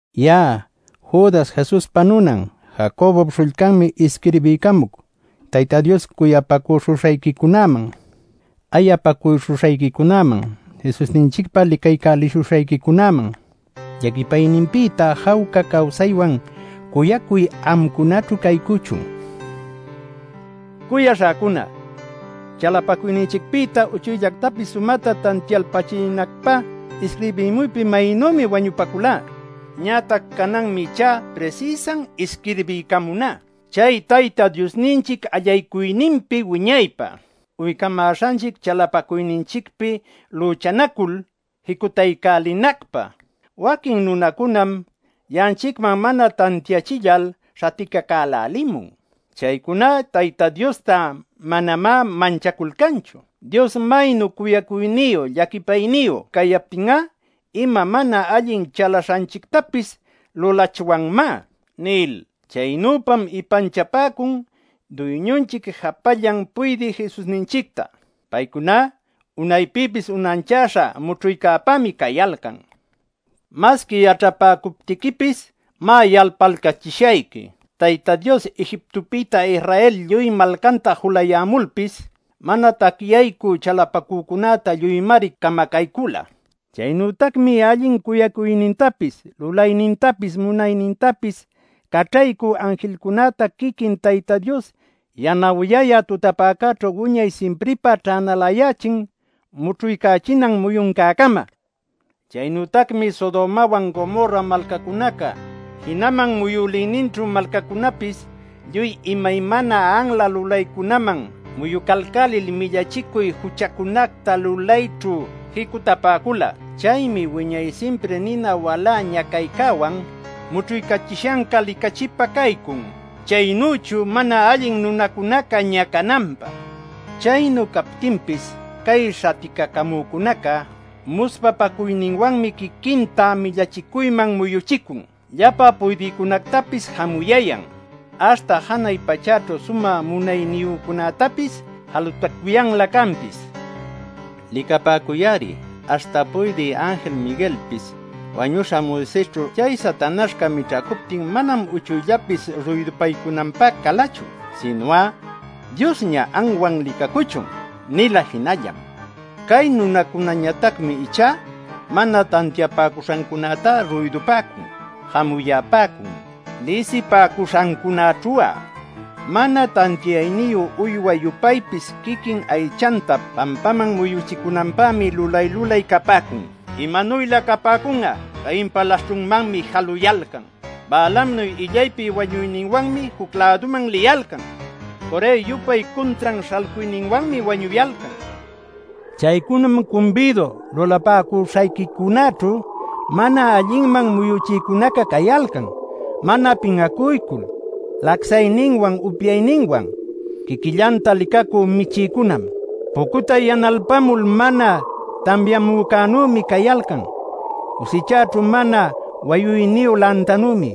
Ya'a Judas Jesuspa nunan, Jacobop śhullcanmi isquirbiycamuc Tayta Dios cuyapäcuśhuśhayquicunäman, ayapäcuśhuśhayquicunäman, Jesusninchicpa licaycälishuśhayquicunäman. Llaquipayninpïta jawca cawsaywan cuyacuy amcunaćhu caycuchun. Cuyaśhäcuna, chalapacuyninchicpïta uchuyllactapis sumäta tantialpälichinacpä isquirbimuypi maynümi wañupaculá. Ñatac cananmi ichá prisïsan isquirbiycamuná, chay Tayta Diosninchic allaycuyninpi wiñaypä uycamäśhanchic chalapacuyninchicpi lüchanacul jicutaycälinacpä. Waquin nunacunam ya'anchicman mana tantiachillal śhaticacälälimun. Chaycuná Tayta Diosta manamá manchaculcanchu “Dios maynu cuyacuyniyu llaquipayniyu cayaptin'a ima mana allin chalaśhanchictapis lulachwanmá” nil. Chaynüpam ipanchapäcun Duyñunchic japallan puydï Jesusninchicta. Paycuná unaypïpis unanchäśha mućhuycäpämi cayalcan. Masqui yaćhapäcuptiquipis, má, yalpalcachishayqui: Tayta Dios Egiptopïta Israel lluy malcanta julayämulpis, mana tacyaycü chalapacücunätá lluymari camacaycüla. Chaynütacmi allin caycuynintapis, lulaynintapis, munaynintapis caćhaycü anjilcunäta quiquin Tayta Dios yanawyayä tutapäcäćhu wiñay simpripä ćhänalayächin mućhuycachinan muyuncäcama. Chaynütacmi Sodomawan Gomorra malcacunaca, jinaman muyülïninćhu malcacunäpis lluy imaymana anla lulaycunaman muyucalcälil millachicuy juchacunacta lulayćhu jicutapäcula. Chaymi wiñay simpri nina walä ñacaycäwan mućhuycachishanca licachipä caycun chaynüchu mana allin nunacunaca ñacananpä. Chaynu captinpis cay śhaticacamücunaca muspapacuyninwanmi quiquinta millachicuyman muyuchicun, llapa puydïcunactapis jamuyayan, aśhta janay pachäćhu sumä munayniyücunätapis jalutacuyanlä canpis. Licapäcuy-ari aśhta puydï anjil Miguelpis wañüśha Moisesćhu chay Satanaśhca mićhacuptin manam uchuyllapis ruydupaycunanpä calachu, sinu'a “¡Diosña anwan licacuchun!” nila jinallam. Cay nunacunäñatacmi ichá mana tantiapäcuśhancunätá ruydupäcun, jamuyapäcun. Lisipäcuśhancunaćhu'a, mana tantiayniyu uywa-yupaypis quiquin aychanta pampaman muyuchicunanpämi lulay-lulay capäcun. ¡Imanuylä capäcun'a! ¡Cainpa laśhćhunmanmi jaluyalcan! ¡Balaamnuy illaypi wañuyninwanmi juc-läduman liyalcan! ¡Corë-yupay cuntran śhalcuyninwanmi wañuyalcan! Chaycunam cumbidu lulapäcuśhayquicunäćhu mana allinman muyuchïcunaca cayalcan mana pin'acuycul lacsayninwan upyayninwan; quiquillanta licacü michïcunam. Pucutay yanalpamul mana tamyamücänümi cayalcan; cusichaćhu mana wayuyniyu lantanümi;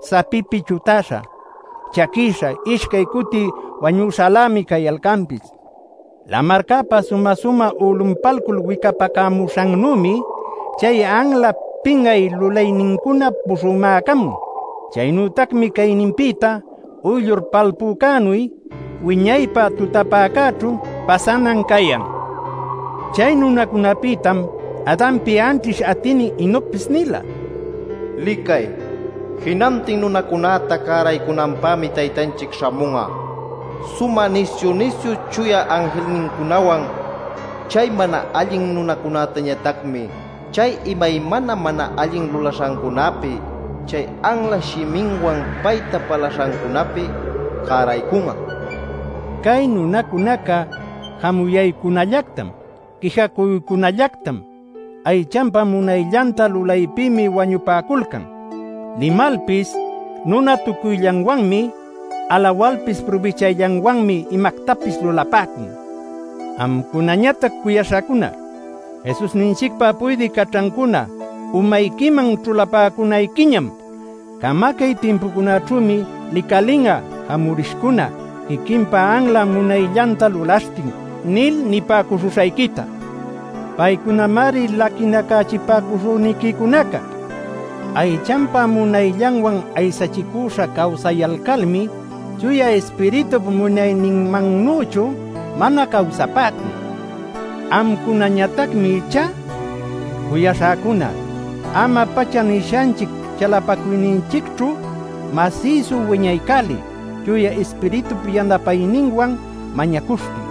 sapipi chutäśha, chaquïsha, ishcay cuti wañüśhalämi cayalcanpis. Lamarcäpa sumä-sumä ulunpalcul wicapacamuśhannümi chay anla pin'ay lulaynincuna pushumacamun. Chaynütacmi cayninpïta uyllur palpücänuy wiñaypä tutapäcäćhu pasanan cayan. Chay nunacunapïtam Adanpi anćhish atïnin Enocpis nila: “Licay, jinantin nunacunäta cäraycunanpämi Taytanchic śhamun'a sumä nisyu-nisyu chuya anjilnincunawan. Chay mana allin nunacunätañatacmi chay imaymana mana allin lulaśhancunapi, chay anla shiminwan payta palaśhancunapi cäraycun'a” nil. Cay nunacunaca jamuyaycunallactam, quijacuycunallactam, aychanpa munayllanta lulaypïmi wañupaculcan. Limalpis nunatucuyllanwanmi, alawalpis prubichayllanwanmi imactapis lulapäcun. Amcunañatac cuyaśhäcuna, Jesusninchicpa puydï caćhancuna umayquiman ćhulapäcunayquiñam “Camacay timpucunaćhümi licalin'a jamurishcuna quiquinpa anla munayllanta lulaśhtin” nil nipäcuśhuśhayquita. Paycunamari laquinacachipäcuśhüniquicunaca. Aychanpa munayllanwan aysachicüśha cawsayalcalmi Chuya Ispiritup munayninmannüchu mana cawsapäcun. Amcunañatacmi ichá, cuyaśhäcuna, ama-pacha nishanchic chalapacuyninchicćhu masïsu wiñaycäliy Chuya Ispiritup yanapayninwan mañacuśhtin.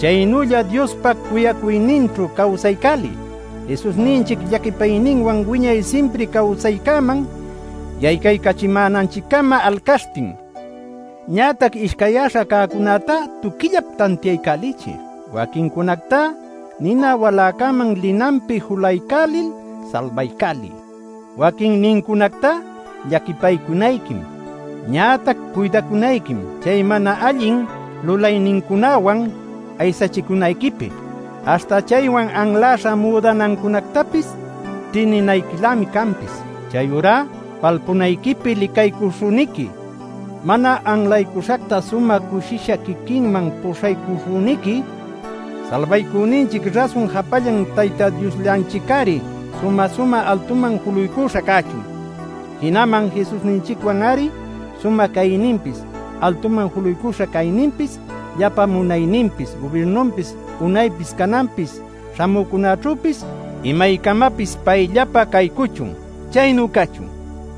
Chaynülla Diospa cuyacuyninćhu cawsaycäliy Jesusninchic llaquipayninwan wiñay simpri cawsaycäman yaycaycachimänanchic-cama alcaśhtin. Ñatac ishcayyäśha cäcunätá tuquillap tantiaycälichiy. Waquincunactá nina waläcäman linanpi julaycälil salbaycäliy. Waquinnincunactá llaquipaycunayquim. Ñatac cuydacunayquim chay mana allin lulaynincunawan aysachicunayquipi; aśhta chaywan anläśha müdanancunactapis ćhïninayquilämi canpis. ¡Chayurá, palpunayquipi licaycuśhüniqui, mana anlaycuśhacta sumä cushisha quiquinman puśhaycuśhüniqui Salbaycüninchic rasun japallan Tayta Diosllanchic-ari sumä-sumä altuman juluycuśha cachun! ¡Jinaman Jesusninchicwan-ari sumä cayninpis, altuman juluycuśha cayninpis, llapa munayninpis, gubirnuninpis, unaypis, cananpis, śhamücunäćhüpis, imaycamapis payllapä caycuchun! Chaynu cachun.